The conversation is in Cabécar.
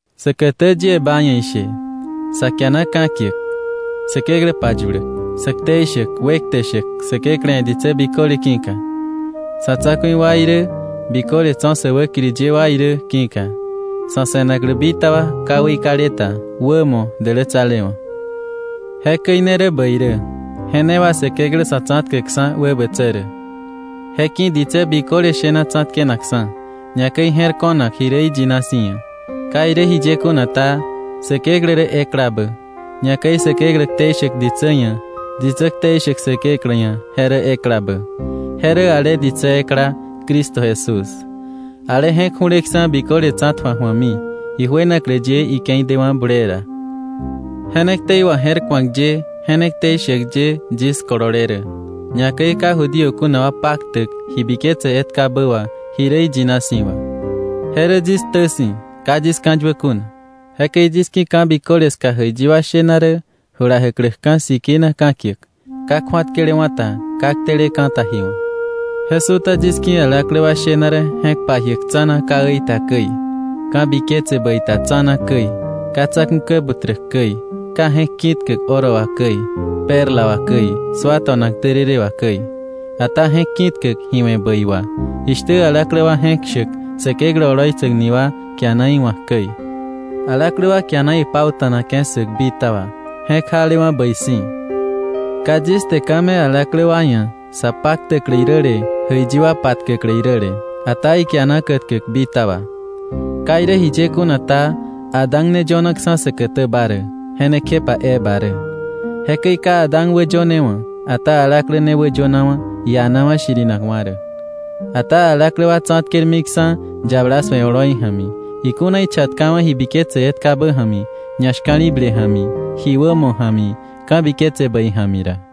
Säkätä yie ba ia̱ ishe: sa kiana ka̱kiäk, Säkeklä payuläk, sä ktei shäk, wekte shäk Säkeklä ia̱ ditsä biköle ki̱ka, sa̱ tsa̱ku̱i wa irä biköle tso̱ sä wäkiri ye wa irä ki̱ka, sa̱ se̱naklä bitaba ka weikale ta, wämo, dälätsalewa̱. Jekäi ne rä bäi rä, je ne wà Säkeklä Sa̱tsa̱tkäkksa̱ wäbätsä rä. Je ki̱ ditsä biköle shena tsa̱tkenakksa̱, ñakäi je̱r ko̱nak ji rä iyina si̱ ia̱. Ka irä jiye kuna ta, Säkeklä rä eklabä. Ñakäi Säkeklä ktei shäk ditsä ia̱, ditsä ktei shäk Säkeklä ia̱ je rä eklabä. Je rä ale ditsä ekla Cristo Jesús, ale je̱k ju̱leksa̱ biköle tsa̱tju̱ak ju̱ami, ijuenaklä ye ike̱i dewa̱ bulee ra. Je ne ktei waje̱rku̱ak ye, je ne ktei shäk ye yis kolole rä, ñakäi ka Judío kuna wa paktäk ji biketse etkabä wà ji rä iyina si̱ wà. Je rä yis ktä si̱, ka yis ka̱yuä kuna. Jekäi yis ki̱ ka̱biköle ska jäiyi wa shena rä jula jäkläkka̱ sikina ka̱kiäk, ka kju̱atkelewa̱ ta ka kteleka̱ ta ji wa̱. Je su̱ta yis ki̱ alaklä wa shena rä je̱k pajiäk tsa̱na ka äi ta käi, ka̱biketse bäi ta tsa̱na käi, ka tsa̱ku̱ kä buträk käi, ka je̱k ki̱tkäk oro wà käi, perla wà käi, sua to̱nak därërë wà käi, ata je̱k ki̱tkäk ji we̱ bäi wà, jishtä alaklä wa je̱k shäk Säkeklä oloitsäk ni wa kiana iwa̱k käi. Alaklä wa kiana ipauta̱nake̱ ssäk bitaba, je̱k jalewa̱ bäi si̱. Ka yis te ka̱ me̱ alaklä wa ia̱ sa paktäklä iräle, jäiyi wa patkäklä iräle. Ata ikiana kätkäk bitaba. Ka irä jiye kuna ta, Adán ne yönaksa̱ säkätäba rä, je ne kjepa Eva rä. Jekäi ka Adán wäyönewa̱. Ata alaklä ne wäyönawa̱ ianawa̱ shirinakwa̱ rä. Ata alaklä wa tsa̱tkermiksa̱ yabala su̱e oloi ja̱mi, ikuna ichatkawa̱ ji biketse etkabä ja̱mi, ñashka̱li̱ble ja̱mi, ji wämo ja̱mi, ka̱biketse bäi ja̱mi ra.